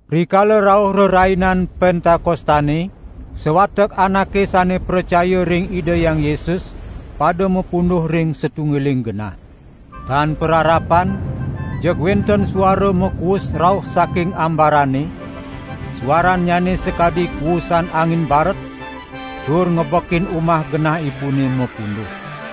Rikala rauh Rerainan Pentakostane, sawatek anake sane pracaya ring Ida Hyang Yesus pada mapunduh ring satunggiling genah. Tan pararapan jeg wenten suara makuus rauh saking ambarane, suarannyane sakadi kuusan angin baret tur ngebekin umah genahipune mapunduh.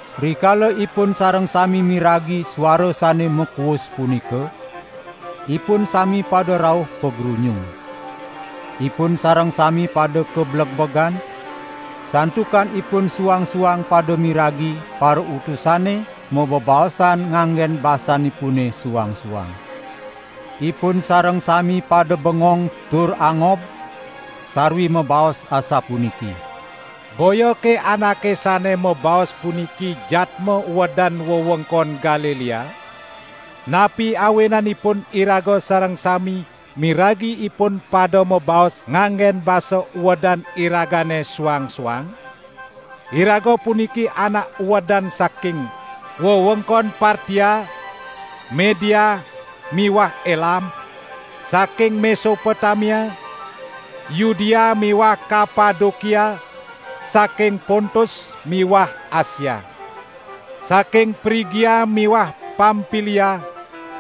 Rikala ipun sareng sami miragi suara sane makuus punika, ipun sami pada rauh pagrunyung. Ipun sareng sami pada kablegbegan, santukan ipun suang-suang pada miragi parautusane mabebaosan nganggen basanipune suang-suang. Ipun sareng sami pada bengong tur angob, sarwi mabaos asapuniki: "Boyake anake sane mabaos puniki jadma uedan wewengkon Galilea? Napi awinanipun iraga sareng sami miragi ipun pada mabaos nganggen basa uedan iragane suang-suang? Iraga puniki anak uedan saking: wewengkon Partia, Media miwah Elam, saking Mesopotamia, Yudea miwah Kapadokia, saking Pontus miwah Asia; saking Prigia miwah Pampilia,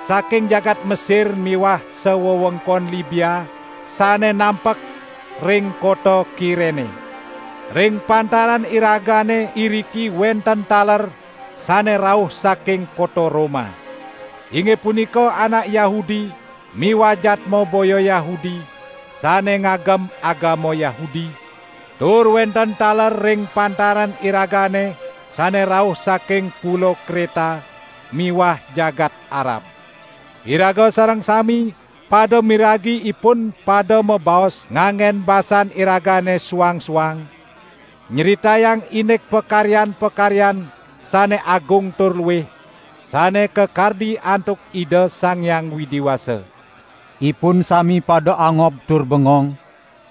saking jagat Mesir miwah sawewengkon Libia sane nampek ring kota Kirene. Ring pantaran iragane iriki wenten taler sane rauh saking kota Roma; inggih punika anak Yahudi miwah jadma boya Yahudi sane ngagem agama Yahudi, tur wenten taler ring pantaran iragane sane rauh saking Pulo Kreta miwah jagat Arab. Iraga sareng sami pada miragi ipun pada mabaos nganggen basan iragane suang-suang, nyritayang indik pakaryan-pakaryan sane agung tur luih, sane kakardi antuk Ida Sang Hyang Widi Wasa." Ipun sami pada angob tur bengong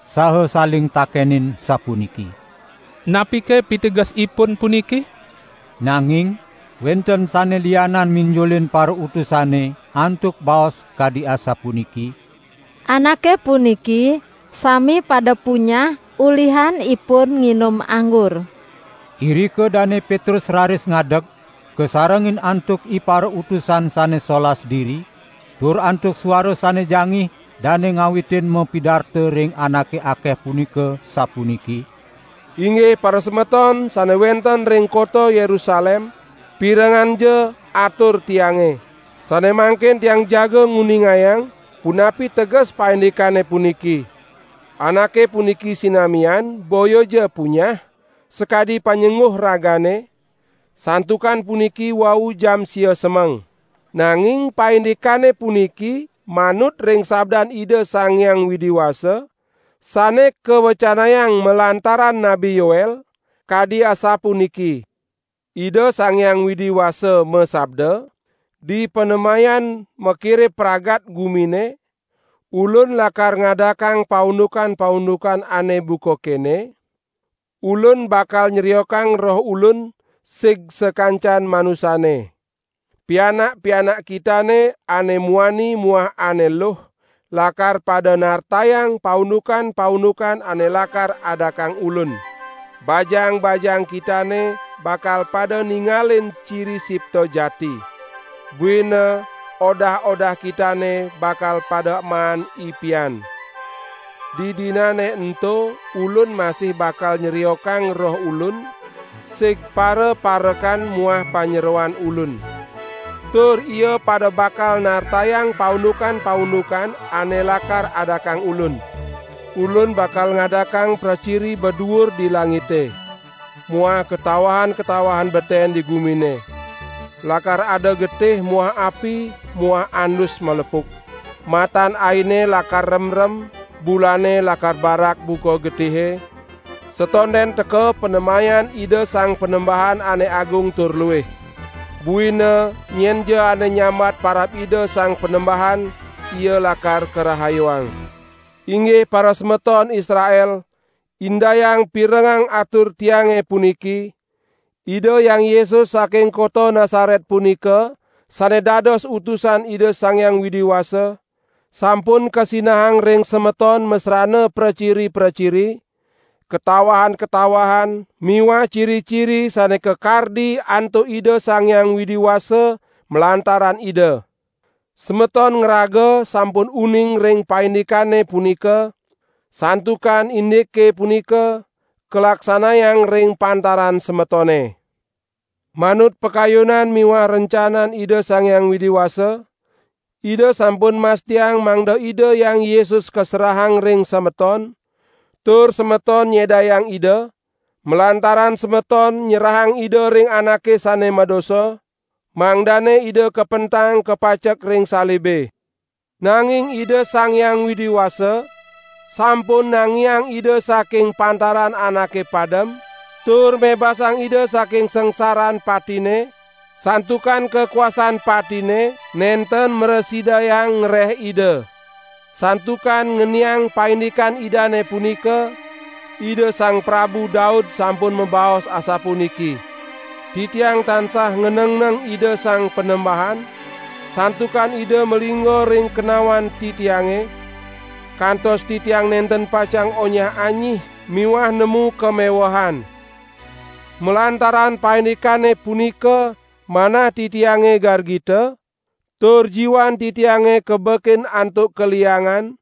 saha saling takenin, sapuniki: "Napike pitegesipun puniki?" Nanging wenten sane lianan minjulin parautusane antuk baos kadi asapuniki: "Anake puniki sami pada punyah ulihan ipun nginum anggur." Irika Dane Petrus raris ngadeg, kasarengin antuk iparautusan sane solas diri, tur antuk suara sane jangih dane ngawitin mapidarta ring anake akeh punika, sapuniki: "Inggih parasemeton sane wenten ring kota Yerusalem, pirengangja atur tiange. Sane mangkin tiang jaga nguningayang punapi teges paindikane puniki. Anake puniki sinamian boyaja punyah sakadi panyengguh ragane, santukan puniki wau jam sia semeng. Nanging paindikane puniki manut ring sabdan Ida Sang Hyang Widi Wasa, sane kawecanayang malantaran Nabi Yoel, kadi asapuniki: 'Ida Sang Hyang Widi Wasa masabda: Dipanemayan makire pamragat gumine, Ulun lakar ngadakang paundukan-paundukan ane buka kene; Ulun bakal nyriokang Roh Ulun sig sakancan manusane. Pianak-pianak kitane ane muani muah ane luh lakar pada nartayang paundukan-paundukan ane lakar adakang Ulun. Bajang-bajang kitane bakal pada ningalin ciri sipta jati. Buina odah-odah kitane bakal pada maan ipian. Didinane ento Ulun masih bakal nyriokang Roh Ulun sig paraparekan muah panyeroan Ulun. Tur ia pada bakal nartayang paundukan-paundukan ane lakar adakang Ulun. Ulun bakal ngadakang praciri baduur di langite. Muah katawahan-katawahan beten di gumine. Lakar ada getih muah api muah andus malepuk. Matan aine lakar remrem, bulane lakar barak buka getihe, satonden teka panemayan Ida Sang Panembahan ane agung tur luih. Buina nyenja ane nyambat parab Ida Sang Panembahan ia lakar karahayuang.' Inggih parasemeton Israel, indayang pirengang atur tiange puniki: Ida Hyang Yesus saking kota Nasaret punika, sane dados utusan Ida Sang Hyang Widi Wasa, sampun kasinahang ring semeton masrana praciri-praciri, katawahan-katawahan miwah ciri-ciri sane kakardi antuk Ida Sang Hyang Widi Wasa malantaran Ida. Semeton ngraga sampun uning ring paindikane punika, santukan indike punika, kalaksanayang ring pantaran semetone. Manut pakayunan miwah rencanan Ida Sang Hyang Widi Wasa, Ida sampun mastiang mangda Ida Hyang Yesus kaserahang ring semeton; tur semeton nyedayang Ida, malantaran semeton nyerahang Ida ring anake sane madosa, mangdane Ida kapentang kapacek ring salibe. Nanging Ida Sang Hyang Widi Wasa sampun nangiang Ida saking pantaran anake padem, tur mebasang Ida saking sangsaran patine, santukan kakuasan patine nenten mrasidayang ngreh Ida. Santukan ngeniang paindikan Idane punika, Ida Sang Prabu Daud sampun mabaos asapuniki: 'Titiang tansah nganengneng Ida Sang Panembahan, santukan Ida malingga ring kenawan titiange, kantos titiang nenten pacang onyah-anyih miwah nemu kamewehan. Malantaran paindikane punika manah titiange gargita, tur jiwan titiange kabekin antuk kaliangan,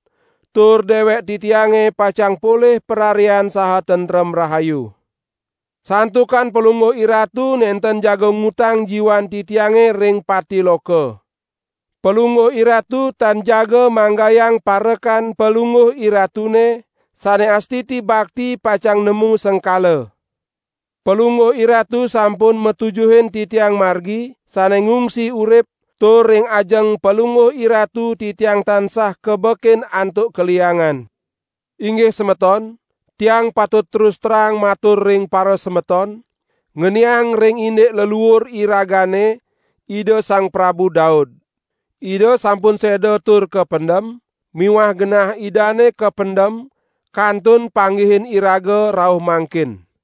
tur dewek titiange pacang polih pararian saha tentrem rahayu. Santukan Palungguh IRatu nenten jaga ngutang jiwan titiange ring pati loka. Palungguh IRatu tan jaga manggayang parekan Palungguh IRatune sane astiti bakti pacang nemu sengkala. Palungguh IRatu sampun matujuhin titiang margi sane ngungsi urip, tur ring ajeng Palungguh IRatu titiang tansah kabekin antuk kaliangan!' Inggih semeton, tiang patut terus terang matur ring parasemeton, ngeniang ring indik leluur iragane Ida Sang Prabu Daud. Ida sampun seda tur kapendem miwah genah idane kapendem kantun panggihin iraga rauh mangkin.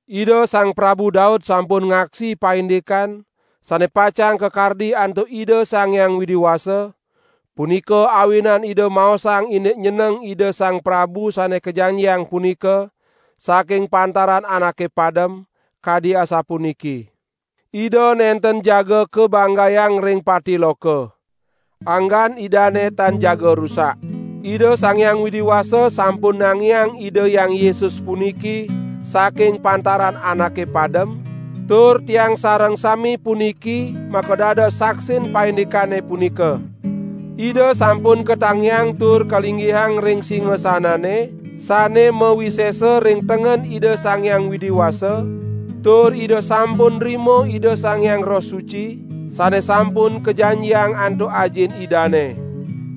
Ida Sang Prabu Daud sampun ngaksi paindikan sane pacang kakardi antuk Ida Sang Hyang Widi Wasa, punika awinan ida maosang indik nyeneng Ida Sang Prabu Sane Kajanjiang punika, saking pantaran anake padem, kadi asapuniki: Ida nenten jaga kabanggayang ring Pati loka. Anggan Idane tan jaga rusak.' Ida Sang Hyang Widi Wasa sampun nangiang Ida Hyang Yesus puniki saking pantaran anake padem, tur tiang sareng sami puniki makadados saksin paindikane punika. Ida sampun katangiang tur kalinggihang ring singasanane sane mawisesa ring tengen Ida Sang Hyang Widi Wasa, tur Ida sampun nrima Ida Sang Hyang Roh Suci sane sampun kajanjiang antuk Ajin Idane.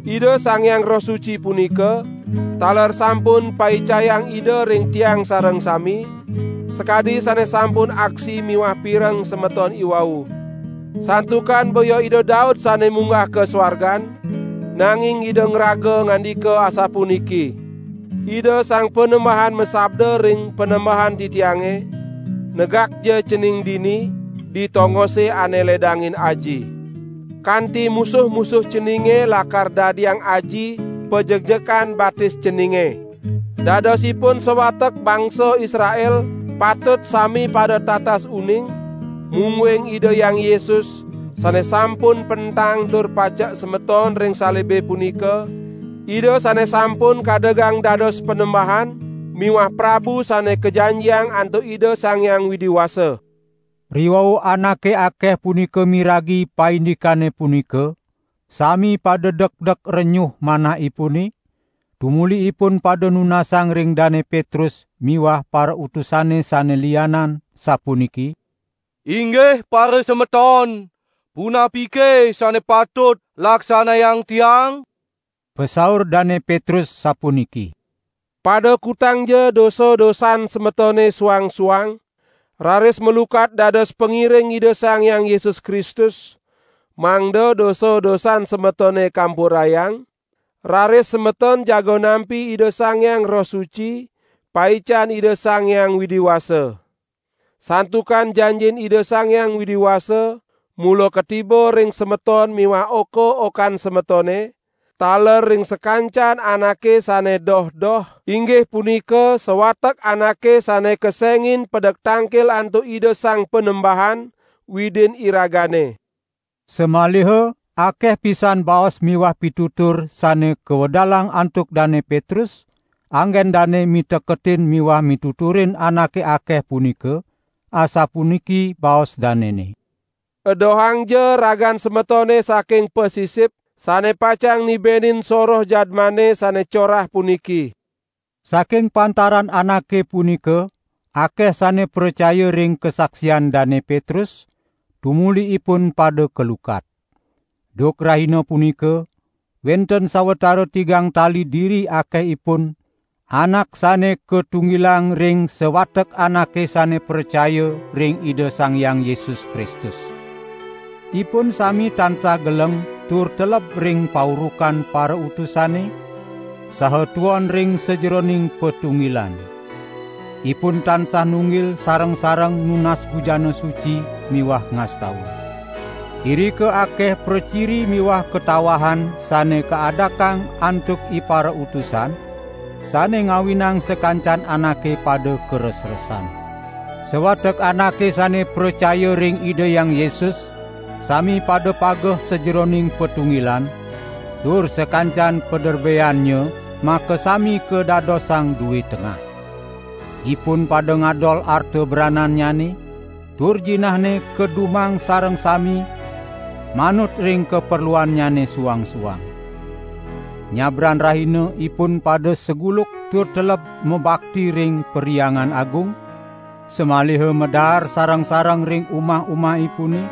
Ida Sang Hyang Roh Suci punika taler sampun paicayang Ida ring tiang sareng sami, sakadi sane sampun aksi miwah pireng semeton iwau. Santukan boya Ida Daud sane munggah ka suargan, nanging ida ngraga ngandika asapuniki: Ida Sang Panembahan masabda ring Panembahan titiange: Negakja cening dini di tongose ane ledangin Aji. Kanti musuh-musuh ceninge lakar dadiang Aji pajekjekan batis ceninge.' Dadosipun sawatek bangsa Israel patut sami pada tatas uning, mungguing Ida Hyang Yesus, sane sampun pentang tur pacek semeton ring salibe punika, Ida sane sampun kadegang dados Panembahan miwah Prabu Sane Kajanjiang antuk Ida Sang Hyang Widi Wasa!" Riwau anake akeh punika miragi paindikane punika, sami pada dekdek renyuh manahipune, tumuli ipun pada nunasang ring Dane Petrus miwah parautusane sane lianan, sapuniki: "Inggih parasemeton, punapike sane patut laksanayang tiang?" Pasaur Dane Petrus, sapuniki: "Pada kutangja dosa-dosan semetone suang-suang, raris malukat dados pangiring Ida Sang Hyang Yesus Kristus, mangda dosa-dosan semetone kampurayang; raris semeton jaga nampi Ida Sang Hyang Roh Suci, paican Ida Sang Hyang Widi Wasa. Santukan janjin Ida Sang Hyang Widi Wasa, mula katiba ring semeton miwah oka-okan semetone, taler ring sakancan anake sane doh-doh, inggih punika sawatek anake sane kesengin pedek tangkil antuk Ida Sang Panembahan, Widin iragane." Samaliha akeh pisan baos miwah pitutur sane kawedalang antuk Dane Petrus anggen dane miteketin miwah mituturin anake akeh punika, asapuniki baos danene: "Edohangja ragan semetone saking pasisip sane pacang nibenin soroh jadmane sane corah puniki!" Saking pantaran anake punika akeh sane pracaya ring kasaksian Dane Petrus, tumuli ipun pada kalukat. Duk rahina punika wenten sawatara tigang tali diri akehipun anak sane katunggilang ring sawatek anake sane pracaya ring Ida Sang Hyang Yesus Kristus. Ipun sami tansah geleng tur teleb ring paurukan parautusane, saha tuon ring sajeroning patunggilan. Ipun tansah nunggil sareng-sareng nunas bujana suci miwah ngastawa. Irika akeh praciri miwah katawahan sane kaadakang antuk iparautusan, sane ngawinang sakancan anake pada karesresan. Sawatek anake sane pracaya ring Ida Hyang Yesus sami pada pageh sajeroning patunggilan, tur sakancan paderbeannya makasami kadadosang due tengah. Ipun pada ngadol arta branannyane, tur jinahne kadumang sareng sami manut ring kaperluannyane suang-suang. Nyabran rahina ipun pada saguluk tur teleb mabakti ring Perhyangan Agung, samaliha madaar sareng-sareng ring umah-umahipune,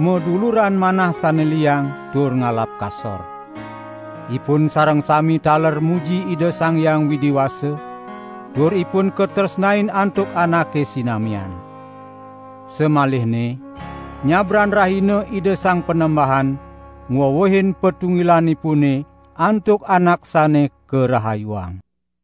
maduluran manah sane liang tur ngalap kasor. Ipun sareng sami taler muji Ida Sang Hyang Widi Wasa, tur ipun katresnain antuk anake sinamian. Samalihne nyabran rahina Ida Sang Panembahan ngwewehin patunggilanipune antuk anak sane karahayuang.